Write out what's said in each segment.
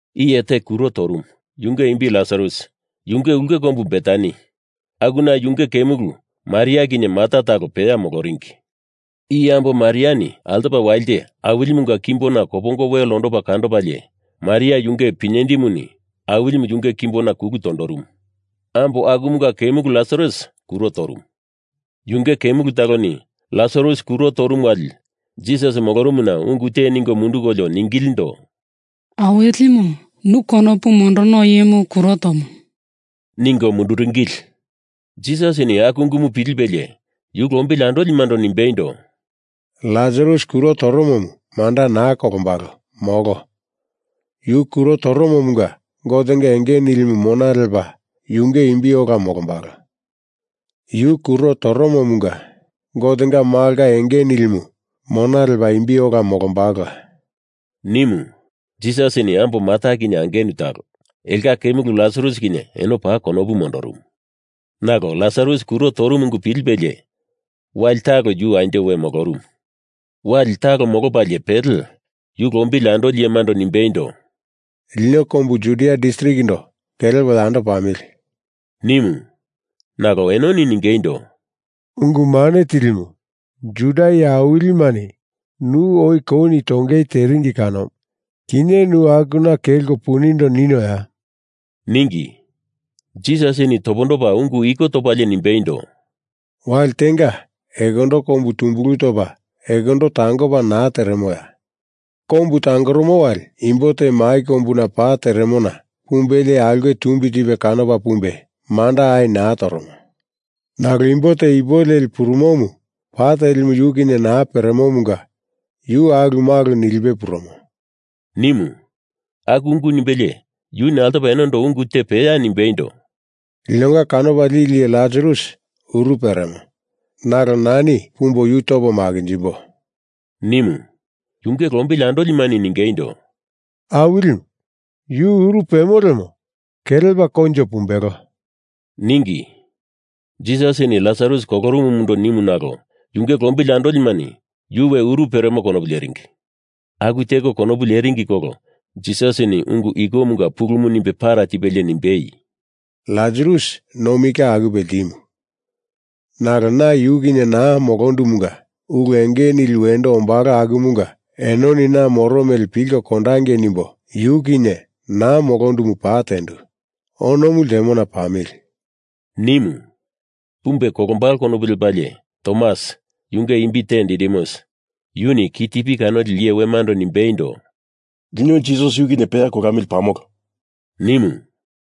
Iye te kuro torumu, yunge imbi Lasarus. Yunge ulke kombu Betani, akuna yunge kemulu Maria kinye Marta talo peya moloringi. I ambo Mariani altopa walite Awilimunga kimbona kopongo wel ondopa kandopalie Maria yunge pinyendimuni Awilimu yunge kimbona kulu tondorumu. Ambo akumunga kemulu Lasarus kuro torumu. Yunge kemulu taloni Lasarus kuro torumu wali Jisas molorumuna ungu te ningo mundukolio ningilindo, “Awilimu, nu konopu mondorono iyemu kuro tomo,” ningo mundurungili. Jisasini aku ungumu pilipelie yu lombili andolimando nimbeindo, “Lasarus kuro toromomu manda naa kolombalo, molo. Yu kuro toromomunga Gotenga enge nilimu mona lepa yunge imbi ola molombalo. Yu kuro toromomunga Gotenga Malonga enge nilimu mona lepa imbi ola molombalola,” nimu. Jisasini ambo Marta kinye angenu talo, elonga kemulu Lasarus kinye eno paa konopu mondorumu. Nalo Lasarus kuro torumu ungu pilipelie, wali talo yu anjo we molorumu. Wali talo molopalie pele yu lombili andoli iyemando nimbeindo, “Lino kombu Judia distrikindo kelepo yando pamili!” nimu. Nalo enoni ningeindo, “Ungu Mane Tilimu, Juda iye awilimani nu oi kouni tongei teringi kanomu. Kinye nu akuna kelko punindo ninoya?” ningi. Jisasini topondopa ungu iko topalie nimbeindo, “Wali tenga ekondo kombu tumbulu topa ekondo tangopa naa teremoya? Kombu tangoromo wali imbo te mai kombuna pa teremona pumbelie aulke tumbi tipe kanopa pumbe manda ai naa toromo. Nalo imbo te ipu leli purumomu pa telimu yu kinye naa peremomunga yu alumalu nilipe purumo,” nimu. Aku ungu nimbelie yuni altopa enondo ungu te peya nimbeindo, “Linonga kanopa lili iye Lasarus uru peremo, nalo nani pumbo yu topo makinjimbo,” nimu. Yunge lombili andolimani ningeindo, “Awilimu, yu uru pemo lemo kelepa koinjo pumbelo,” ningi. Jisasini Lasarus kolorumumundo nimu nalo yunge lombili andolimani yu we uru peremo konopu leringi. Aku teko konopu leringi kolo Jisasini ungu ikomunga pulumu nimbe para tipelie nimbeindo, “Lasarus nomi ka akupe ltimu. Nalo na yu kinye naa molondumunga ulu enge nili wendo ombalo akumunga enoni na moro mele pilko kondongei nimbo yu kinye naa molondumu paa tendu. Onomu ltemona pamili!” nimu. Pumbe kolombalo konopu lepalie, Tomas, yunge imbi te Didimus, yuni ki tipi kanoli iye wemando nimbeindo, “Lino Jisas yu kinye peya kolamili pamolo!” nimu.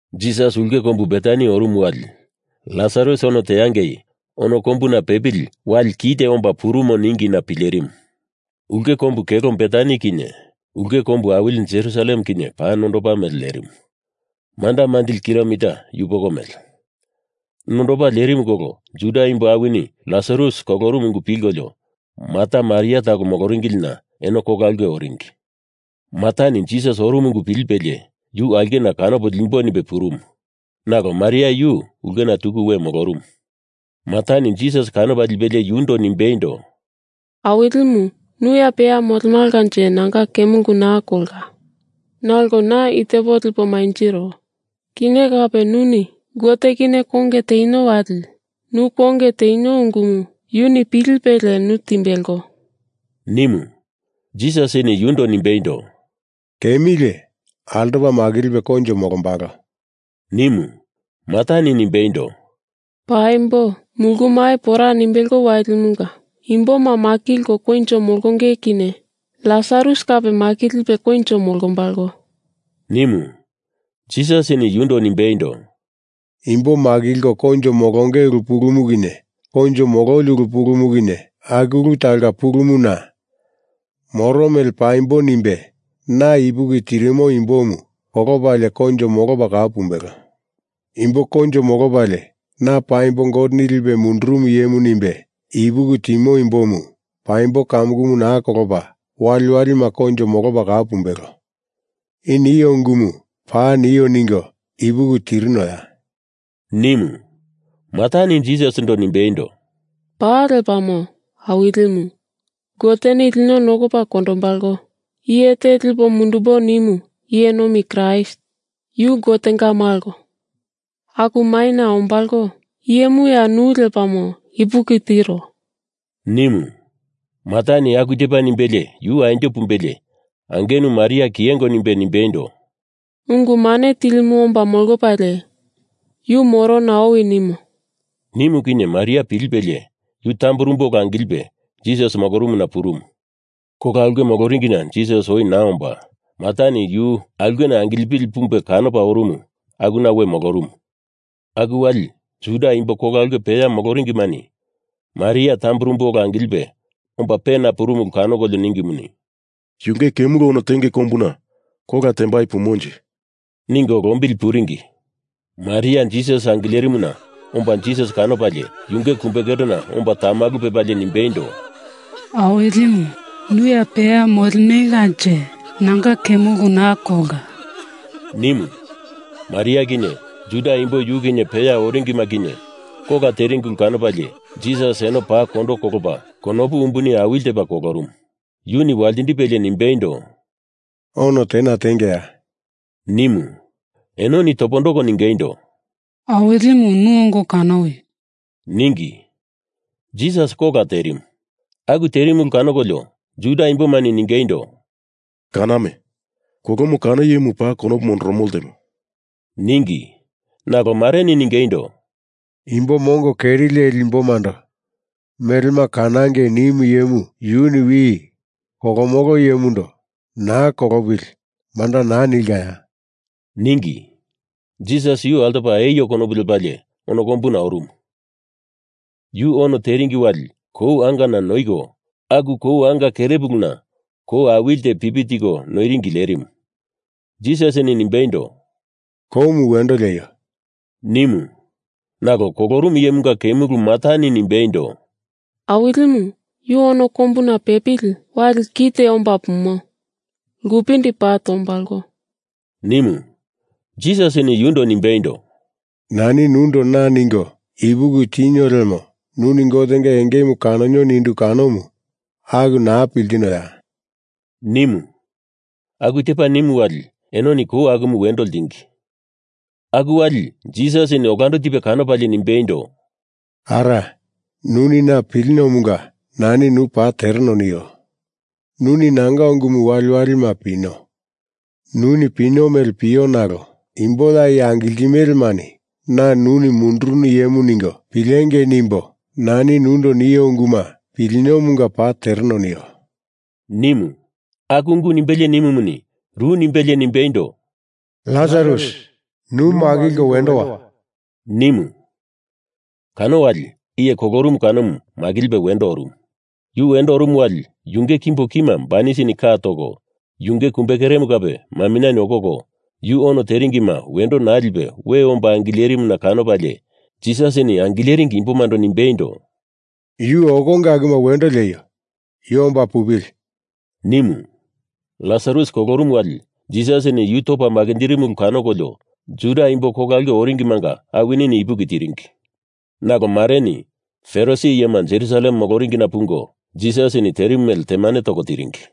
Jisas ulke kombu Betani orumu wali, Lasarus ono teangei ono kombuna pepili wali kite omba purumo ningina pilerimu. Ulke kombu kelo Betani kinye ulke kombu awili Jerusalem kinye paa nondopa mele lerimu, manda manjili kilomita yupoko mele. Nondopa lerimu kolo Juda imbo awini Lasarus kolorumu ungu pilkolio Marta Maria talo moloringilina eno kola aulke oringi. Martani Jisas orumu ungu pilipelie yuni aulkena kanopo limbo nimbe purumu, nalo Maria yu ulke tuku we molorumu. Martani Jisas kanopa lipelie yundo nimbeindo, “Awilimu, nu ya peya molemalanje nanga kemulu naa kolka. Nalo na i tepo lipo manjiro. Kinye kape nuni Gote kinye konge tenio wali nu konge tenio ungumu yuni pilipelie nu timbelo,” nimu. Jisasini yundo nimbeindo, “Kemilie altopa makilipe koinjo molombalo,” nimu. Martani nimbeindo, “Paimbo. Mulu mai pora nimbelo walimunga imboma makilko koinjo molonge kinye Lasarus kape makilipe koinjo molombalo,” nimu. Jisasini yundo nimbeindo, “Imbo makilko koinjo molonge ulu pulumu kinye koinjo mololi ulu pulumu kinye aku ulu talonga pulumu na. Moro mele paimbo nimbe na ipuki tirimo imbomu kolopalie koinjo molopa kau pumbelo. Imbo koinjo molopalie na paimbo Goteni lipe mundurumu iyemu nimbe ipuki timo imbomu paimbo kamukumu naa kolopa waliwalima koinjo molopa kau pumbelo. I nio ungumu, paa nio ningo ipuki tirinoya?” nimu. Martani Jisasindo nimbeindo, “Paa lepamo, Awilimu. Goteni lino nokopa kondombalo iye te lipo mundumbo nimu iye nomi Kraist, yu Gotenga Malo, aku maina ombalo iyemuya nu lepamo ipuki tiro,” nimu. Martani aku tepa nimbelie yu anjo pumbelie angenu Maria kiyengo nimbe nimbeindo, “Ungu Mane Tilimu omba molopalie, Yu morona owi nimo,” nimu kani Maria pilipelie yu tamburumbu ola angilipe Jisas molorumuna purumu. Kola ulke moloringina Jisas oi naa omba, Martani yu aulkena angilipili pumbe kanopa orumu akuna yu we molorumu. Aku wali Juda imbo kola ulke peya moloringimani Maria tamburumbu ola angilipe omba pena purumu ulu kanokolio ningimuni, “Yunge kemulu ono tengei kombuna kola tembai pumonje,” ningo lombili puringi. Maria Jisas angilerimuna omba Jisas kanopalie yunge kumbekerena omba tamalu pepalie nimbeindo, “Awilimu, nu ya peya molemalanje nanga kemulu naa kolka,” nimu. Maria kinye Juda imbo yu kinye peya oringima kinye kola teringi ulu kanopalie Jisas eno paa kondo kolopa konopu umbuni awili tepa kolorumu. Yuni waltindipelie nimbeindo, “Ono tena tengeya?” nimu. Enoni topondoko ningeindo, “Awilimu, nu ongo kanowi,” ningi. Jisas kola terimu. Aku terimu ulu kanokolio Juda imbomani ningeindo, “Kaname! Kolomo kano iyemu paa konopu mondoromo ltemo,” ningi. Nalo mareni ningeindo, “Imbo mongo keri leli imbomando melema kanangei nimu iyemu yuni wi kolomo iyemundo naa kolopili manda naa nilkaya?” ningi. Jisas yu altopa eio konopu lepalie ono kombuna orumu. Yu ono teringi wali kou angana noiko aku kou anga kerepuluna kou awili te pipi tiko noieringi lerimu. Jisasini nimbeindo, “Koumu wendo lieio,” nimu. Nalo kolorumu iyemunga kemulu Martani nimbeindo, “Awilimu, yu ono kombuna pepili wali kite omba pumo lkupindi paa tombalo,” nimu. Jisasini yundo nimbeindo, “Nani nundo na ningo ipuki tinio lemo nuni Gotenga engemu kanonio nindu kanomu aku naa piltinoya?” nimu, Aku tepa nimu wali enoni kou akumu wendo ltingi. Aku wali Jisasini olando tipe kanopalie nimbeindo, “Ara, nuni na piliniomunga nani nu paa tereno nio. Nuni nanga ungumu waliwalima pino, nuni pino mele pio nalo imbo ya i angiltimelemani na nuni mundurunu iyemu ningo pilengei nimbo nani nundo nio unguma piliniomunga paa tereno nio,” nimu. Aku ungu nimbelie nimumuni, ru nimbelie nimbeindo, “Lasarus, nu makilko wendo wa!” nimu. Kano wali iye kolorumu kanomu makilipe wendo orumu. Yu wendo orumu wali yunge kimbo kima banisini ka toko yunge kumbekeremu kape maminyeni okoko yu ono teringima wendo naa lipe we omba angilerimuna kanopalie Jisasini angileringi imbomando nimbeindo, “Yu okonge akuma wendo lieio! Yu omba pupili!” nimu. Lasarus kolorumu wali Jisasini yu topa makinjirimu ulu kanokolio Juda imbo kola ulke oringimanga awinini ipuki tiringi. Nalo mareni Farisi iyema Jerusalem moloringina pungo Jisasini terimu mele temane toko tiringi.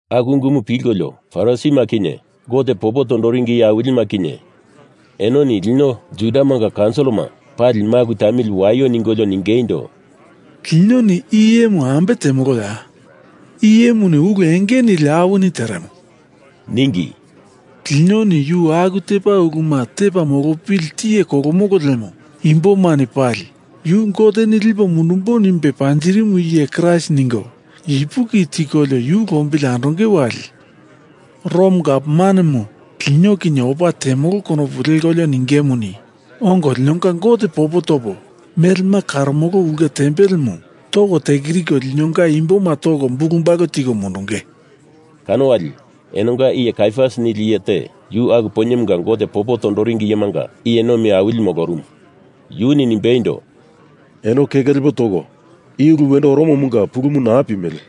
Aku ungumu pilkolio Farisima kinye Gote popo tondoringi iye awilima kinye enoni lino Judamanga kaunsilima pali maku tamili waio ningolio ningeindo, “Linoni i iyemu ambe temoloya? I iyemuni ulu enge nili awini teremo,” ningi. “Linoni yu aku tepa uluma tepa molopili tiye kolomolo lemo imbomani pali yu Goteni lipo mundumbo nimbe panjirimu iye Kraist ningo ipuki tikolio yu lombili andonge wali Rom gavmanemu lino kinye opa temolo konopu lekolio ningemuni, ongo linonga Gote popo topo melema karomolo ulke tempelemu toko tekiriko linonga imboma toko bulubalu tiko mundunge,” ningi. Kano wali enonga iye Kaiafas nili iye te, yu aku poinyemunga Gote popo tondoringi iyemanga iye nomi awilimu molorumu, yuni nimbeindo, “Eno keke lepo toko, i ulu wendo oromomunga pulumu naa pimele.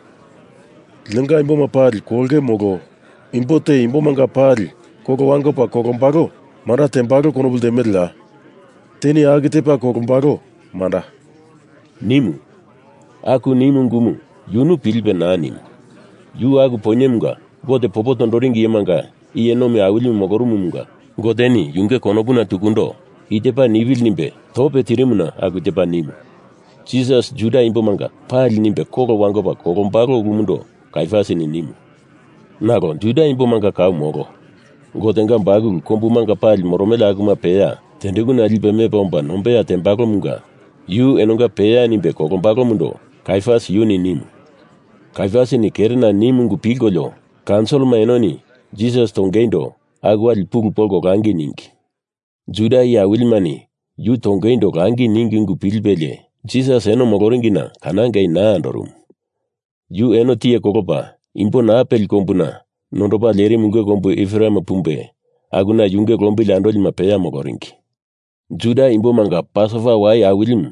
Linonga imboma pali kolonge molo imbo te imbomanga pali kolo wangopa kolombalo manda tembalo konopu ltemeleya? Teni aku tepa kolombalo, manda,” nimu. Aku nimu ungumu yunu pilipe naa nimu. Yu aku poinyemunga Gote popo tondoringi iyemanga iye nomi awilimu molorumumunga Goteni yunge konopuna tukundo i tepa nipili nimbe tope tirimuna aku tepa nimu. Jisas Juda imbomanga pali nimbe kolo wangopa kolombalo ulumundo Kaiafas nimu. Nalo Juda imbomanga kau molo. Gotenga bakulu kombumanga pali moromele akuma peya tendekuna lipe mepa omba nombeya tembalomunga yu enonga peya nimbe kolombalomundo Kaiafas yuni nimu. Kaiafasini kerena nimu ungu pilkolio kaunsilima enoni Jisas tongeindo aku wali pulu polko langi ningi. Juda iye awilimani yu tongeindo langi ningi ungu pilipelie Jisas eno moloringina kanangei naa andorumu. Yu eno tiye kolopa imbo naa peli kombuna nondopa lerimu ulke kombu Ipereme pumbe, akuna yunge lombili andolima peya moloringi. Juda imbomanga Pasova Wai Awilimu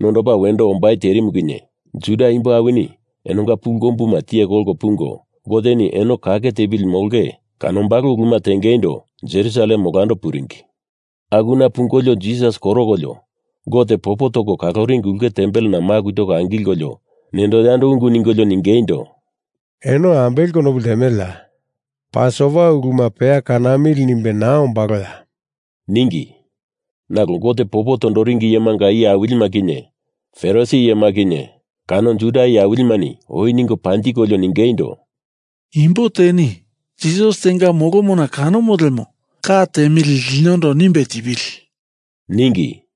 nondopa wendo ombai terimu kinye Juda imbo awini enonga pulu kombuma tiye kolko pungo, Goteni eno kake tepili molonge kanombalo uluma tengeindo Jerusalem olando puringi. Akuna pungolio Jisas korokolio, Gote popo toko kaloringi ulke tempelena maku toko angilkolio nendo yando ungu ningolio ningeindo, “Eno ambele konopu ltemeleya? Pasova uluma peya kanamili nimbe naa ombaloya?” ningi. Nalo Gote popo tondoringi iyemanga iye awilima kinye Farisi iyema kinye kano Juda iye awilimani oi ningo panjikolio ningeindo, “Imbo teni Jisas tenga molomona kanomo lemo, ka tiemili linondo nimbe tipili!” ningi.